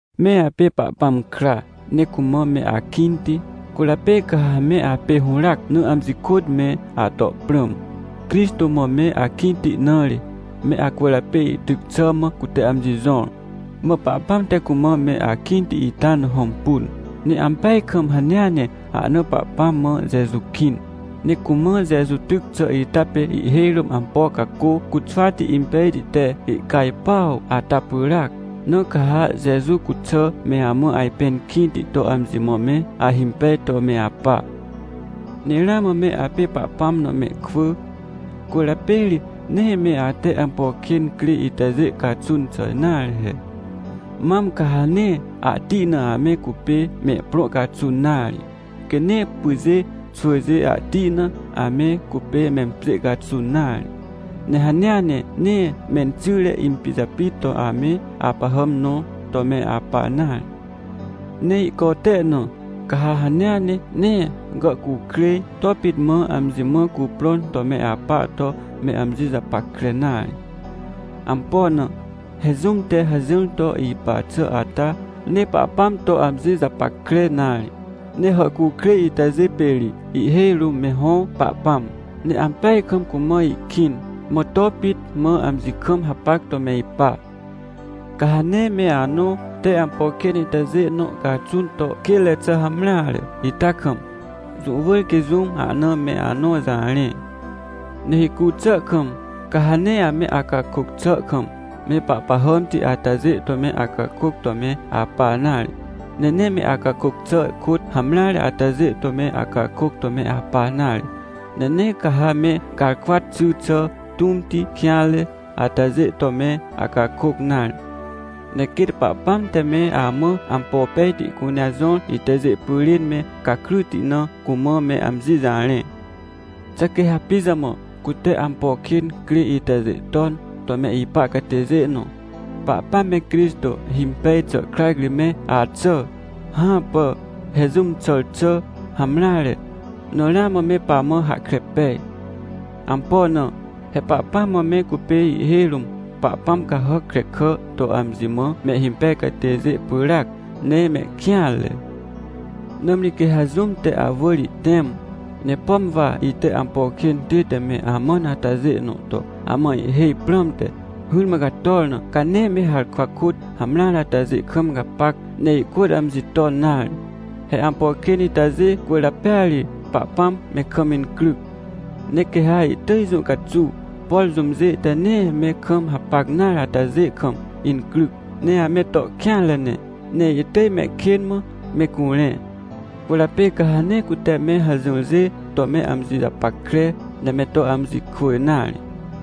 Me apê Pahpãm kra, ne cumã me akĩnti, cwỳrjapê quê ha me apê hũràac na amji kôt me ato prãm. Crixtô mã me akĩnti na ri, me acwỳrjapê ihtyc xà mã cute amji jõr. Mã Pahpãm te cumã me akĩnti ita na hõmpun, ne ampeaj kam hanea ne ahna Pahpãm mã Jeju kĩn. Ne cumã Jeju tyc xà ita pê ihhêj rũm ampo cacô cuxwati impejti te ihcajpuaw ata pyràac. Na ca ha Jeju cuxà me amã ajpẽn kĩnti to amji mã me ahimpej to me apa. Ne ramã me apê Pahpãm na mehkwỳ, cwỳrjapê ri nee me ate ampo kên crê itajê caxun xà nare he. Mam ca ha nee ahti na ame cupê mehprõ caxun nare, quê nee pyjê xwỳjê ahti na ame cupê mempjê caxun nare. Ne hanea ne nee menxyre impijapit to ame apahàm nõ to me apa nare. Ne ihcote na, ca ha hanea ne nee gàhcukrêj to pit mã amji mã cuprõn to me apa to me amji japackre nare. Ampo na? He jũm te hajỹr to ipa xà ata, nee Pahpãm to amji japackre nare, ne hàhcukrêj itajê pê ri ihhêj rũm me hõ pahpãm, ne ampeaj kam cumã ihkĩn, mã to pit mã amji kam hapac to me ipa. Ca ha nee me anõ te ampo kên itajê nõ caxun to kênre xà hamreare ita kam, jũ wỳr quê jũm ahna me anõ jarẽ. Ne hicu xà kam, ca ha nee ame acakôc xà kam, me pahpahàmti atajê to me acakôc to me apa nare. Ne nee me acakôc xà kôt hamreare atajê to me acakôc to me apa nare. Ne nee ca ha me garkwa xỳ xà tũmti kêanre atajê to me acakôc nare. Ne quêt Pahpãm te me amã ampo pejti cunea jõr itajê pyrên me gakryti na, cumã me amji jarẽ. Xà quê ha pijamã cute ampo kên crê itajê ton to me ipa catêjê nõ, Pahpãm me Crixtô himpej xà krac ri me axà? Hãpà! He jũm xàr xà hamreare na ramã me pamã hahkre pej. Ampo na? He Pahpãm mã me cupê ihhêj rũm pahpãm cahàc krekà to amji mã mehhimpej catêjê pyràac, ne mehkêanre. Nãmri quê ha jũm te awỳr ihtẽm, ne pom wa ite ampo kên tête me amãn atajê nõ to amã ihhêj prãmte, hỹrmã gator na, ca nee me harkwa kôt hamreare atajê kam gapac, ne ihkôt amji ton nare. He ampo kên itajê cwỳrjapêa ri Pahpãm me kam incryc. Ne quê ha ihtỳj jũ caxuw, por jũmjê te nee me kam hapac nare atajê kam incryc, ne ame to kêanre ne, ne ihtỳj mehkên mã me curẽ. Cwỳrjapê ca ha nee cute me hajỹrjê to me amji japackre, ne me to amji kwỳ nare.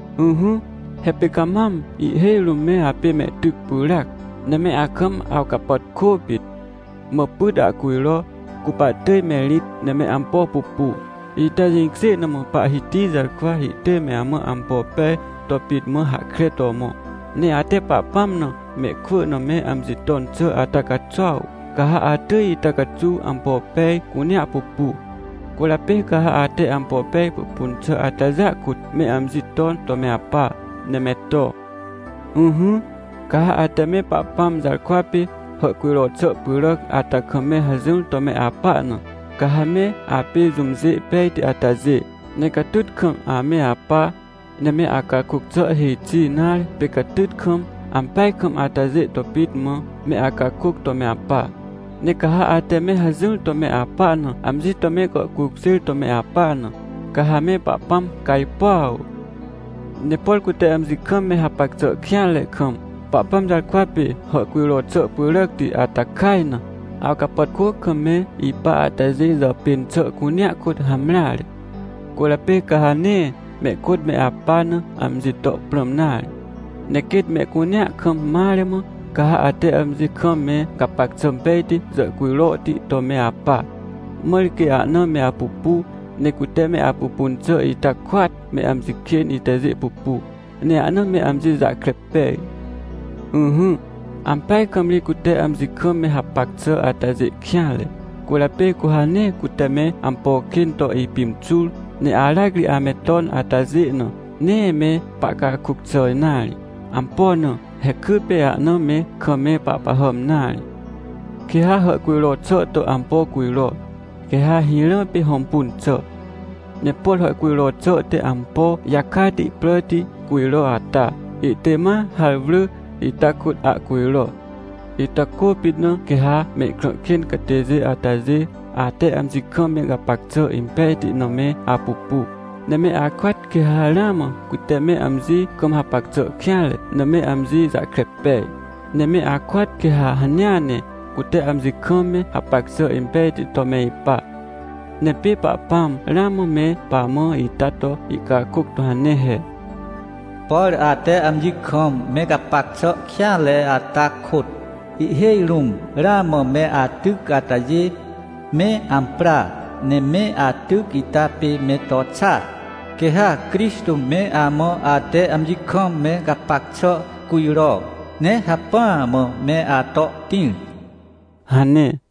Ỹhỹ, he pê ca mam ihhêj rũm me apê mehtyc pyràac, ne me akam awcapàtkô pit. Mã pyt ahcujro, cu pahtỳj me rĩt ne me ampo pupu, ita jĩkjê na mã Pahhiti jarkwa ihtỳj me amã ampo pej to pit mã hahkre to mõ. Ne ate Pahpãm na mehkwỳ na me amji ton xà ata caxuaw, ca ha atỳj ita caxuw ampo pej cunea pupu. Cwỳrjapê ca ha ate ampo pej pupun xà atajêa kôt me amji ton to me apa, ne me to. Ỹhỹ, ca ha ate me Pahpãm jarkwa pê hàhcujro xà pyràc ata kam me hajỹr to me apa na, ca ha me apê jũmjê pejti atajê, ne catyt kam ame apa, ne me acakôc xà hêj xi nare pê catyt kam, ampeaj kam atajê to pit mã, me acakôc to me apa. Ne ca ha ate me hajỹr to me apa na amji to me gàhcukjêr to me apa na, ca ha me Pahpãm cajpuaw. Ne por cute amji kam me hapac xà kêanre kam, Pahpãm jarkwa pê hàhcujro xà pyràcti ata kaj na, awcapàtkô kam me ipa atajê jàpên xà cunea kôt hamreare. Cwỳrjapê ca ha nee mehkôt me apa na amji to prãm nare. Ne quêt mehcunea kam mare mã, ca ha ate amji kam me gapac xà pejti jàhcujrohti to me apa. Mãr quê ahna me apupu, ne cute me apupun xà ita kôat me amji kên itajê pupu, ne ahna me amji jahkre pej. Ỹhỹ, ampeaj kam ri cute amji kam me hapac xà atajê kêanre, cwỳrjapê cu ha nee cute me ampo kên to ipimxur, ne aracri ame ton atajê na, nee me pahcakôc xà nare. Ampo na? He kypê ahna me kam me pahpahàm nare. Quê ha hàhcujro xà to ampo cujro, quê ha hirã pê hõmpun xà. Ne por hàhcujro xà te ampo jakati pràti cujro ata, ihtỳj ma harwrỳ ita kôt ahcujro. Ita kôpit na quê ha mehkrã kên catêjê atajê, ate amji kam me gapac xà impejti na me apupu, ne me akôat quê ha ramã cute me amji kam hapac xà kêanre na me amji jahkre pej. Ne me akôat quê ha hanea ne cute amji kam me hapac xà impejti to me ipa. Ne pê Pahpãm ramã me pamã ita to ihcakôc to hane he: “Por ate amji kam me gapac xà kêanre ata kôt, ihhêj rũm ramã me atyc atajê, me ampra! Ne me atyc ita pê me to xa, quê ha Crixtô me amã ate amji kam me gapac xà cujro, ne hacpỹa mã me ato tĩr!” hane.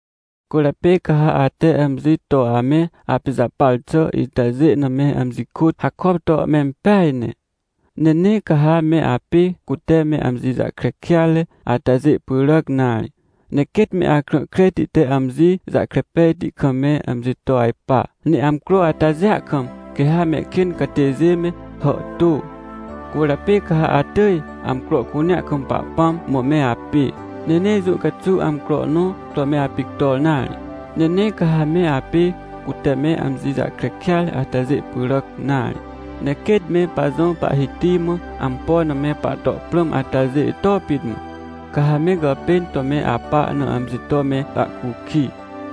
Cwỳrjapê ca ha ate amji to ame apijapar xà itajê na me amji kôt hakop to mempeaj ne. Ne nee ca ha me apê cute me amji jahkre kêatre atajê pyràc nare, ne quêt me akrã kreti te amji jahkre pejti kam me amji to ajpa. Ne amcro atajêa kam, quê ha mehkên catêjê me hàhtô. Cwỳrjapê ca ha atỳj amcro cunea kam Pahpãm mã me apê, ne nee jũ caxuw amcro nõ to me apictor nare. Ne nee ca ha me apê cute me amji jahkre kêatre atajê pyràc nare, ne quêt me pajõ Pahhiti mã ampo na me pahto prãm atajê to pit mã, ca ha me gàpên to me apa na amji to me ahcukij.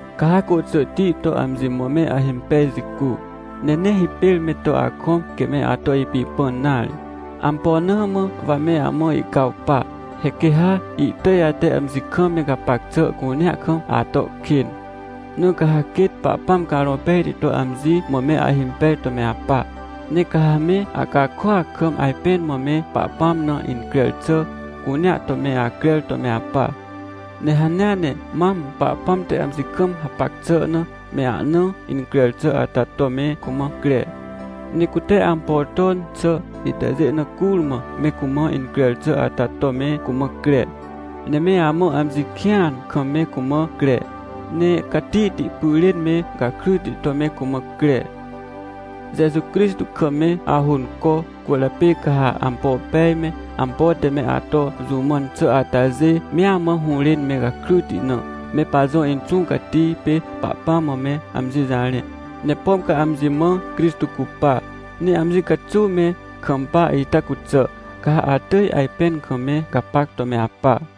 Ca ha côxỳhti to amji mã me ahimpej jicu, ne nee hipêr me to akõm quê me ato ipipãn nare. Ampo na mã wa me amã ihcawpa? He quê ha ihtỳj ate amji kam me gapac xà cunea kam ato kên. Na ca ha quêt Pahpãm Carõ Pejti to amji mã me ahimpej to me apa. Ne ca ha me acakôac kam ajpẽn mã me Pahpãm na increr xà cunea to me acrer to me apa. Ne hanea ne mam Pahpãm te amji kam hapac xà na me ahna increr xà ata to me cumã cre. Ne cute ampo ton xà itajê na curmã me cumã increr xà ata to me cumã cre, ne me amã amji kĩan kam me cumã cre, ne catihti pyrên me gakryti to me cumã cre. Jeju Crixtô kam me ahônco, cwỳrjapê ca ha ampo pej me, ampo te me ato jũ mãn xà atajê mea mã hũrên me gakryti na, me pajõ Inxũ Cati pê Pahpãm mã me amji jarẽ. Ne pom ca amji mã Crixtô cupa, ne amji caxuw me kampa ita cuxà, ca ha atỳj ajpẽn kam me gapac to me apa.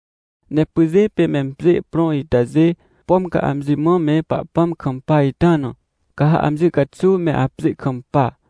Ne pyjê pê mempjê prõ itajê, pom ca amji mã me Pahpãm kampa ita na, ca ha amji caxuw me apjê kampa.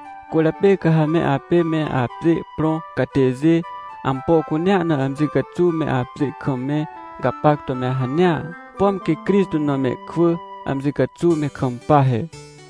Cwỳrjapê ca ha me apê me apjê prõ catêjê, ampo cunea na amji caxuw me apjê kam me gapac to me hanea, pom quê Crixtô na mehkwỳ amji caxuw me kampa he.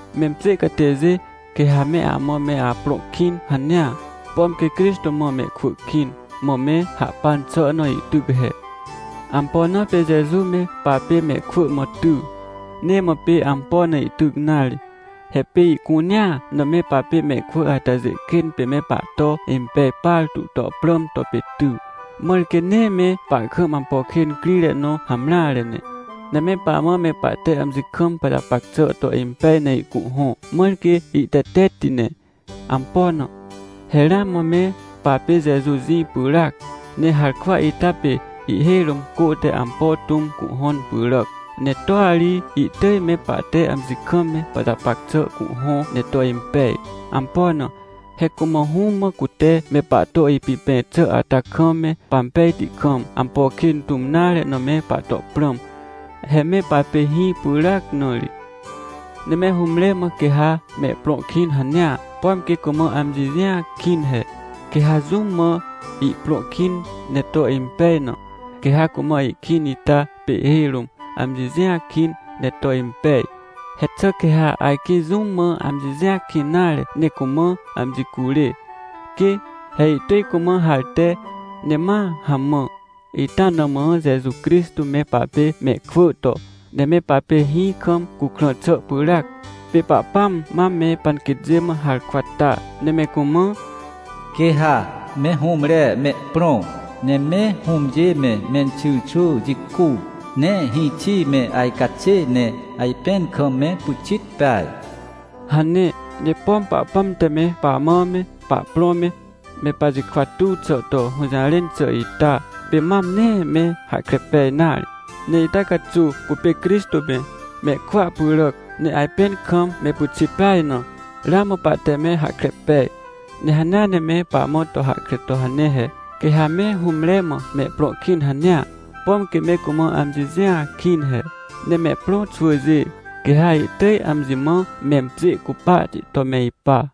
Mempjê catêjê, quê ha me amã me aprõ kĩn hanea, pom quê Crixtô mã mehkwỳ kĩn, mã me hahpan xà na ihtyc he. Ampo na pê Jeju me papê mehkwỳ mã ty? Nee mã pê ampo na ihtyc nare. He pê ihcunea na me papê mehkwỳ atajê kên pê me pahto impej partu to prãm to pê ty, mãr quê nee me pahkam ampo kên crire nõ hamreare ne. Ne me pamã me pahte amji kam pajapac xà to impej ne ihcuhhõ, mãr quê ihtetetti ne. Ampo na? He ramã me papê Jeju jĩ pyràac. Ne harkwa ita pê ihhêj rũm cô te ampo tũm cuhhõn pyràc, ne toa ri ihtỳj me pahte amji kam me pajapac xà cuhhõ ne to impej. Ampo na? He cumã Hũm mã cute me pahto ipipẽ xà ata kam me pampejti kam, ampo kên tũm nare na me pahto prãm. He me papê hĩ pyràac na ri. Ne me hũmre mã quê ha mehprõ kĩn hanea, pom quê cumã amji jĩa kĩn he. Quê ha jũm mã ihprõ kĩn ne to impej na, quê ha cumã ihkĩn ita pê ihhêj rũm, amji jĩa kĩn ne to impej. He xà quê ha ajkĩ jũm mã amji jĩa kĩn nare ne cumã amji curê? Quê! He ihtỳj cumã harte, ne ma hamã. Ita na mã Jeju Crixtô me papê mehkwỳ to, ne me papê hĩ kam cukrã xà pyràac. Pê Pahpãm mam me panquêtjê mã harkwa ta ne me cumã: “Quê ha me hũmre mehprõ, ne me hũmjê me, menxyrxwỳ jicu, ne hĩxi me ajcaxê ne ajpẽn kam me pyxit peaj” hane. Ne pom Pahpãm te me pamã me pahprõ me, me pajikwa tuw xà to hũjarẽn xà ita, pê mam nee me hahkre pej nare. Ne ita caxuw cupê Crixtô me, mehkwỳa pyràc, ne ajpẽn kam me pyxit peaj na, ramã pahte me hahkre pej. Ne hanea ne me pamã to hahkre to hane he. Quê ha me hũmre mã mehprõ kĩn hanea, pom quê me cumã amji jĩa kĩn he. Ne mehprõ xwỳjê, quê ha ihtỳj amji mã mempjê cupahti to me ipa.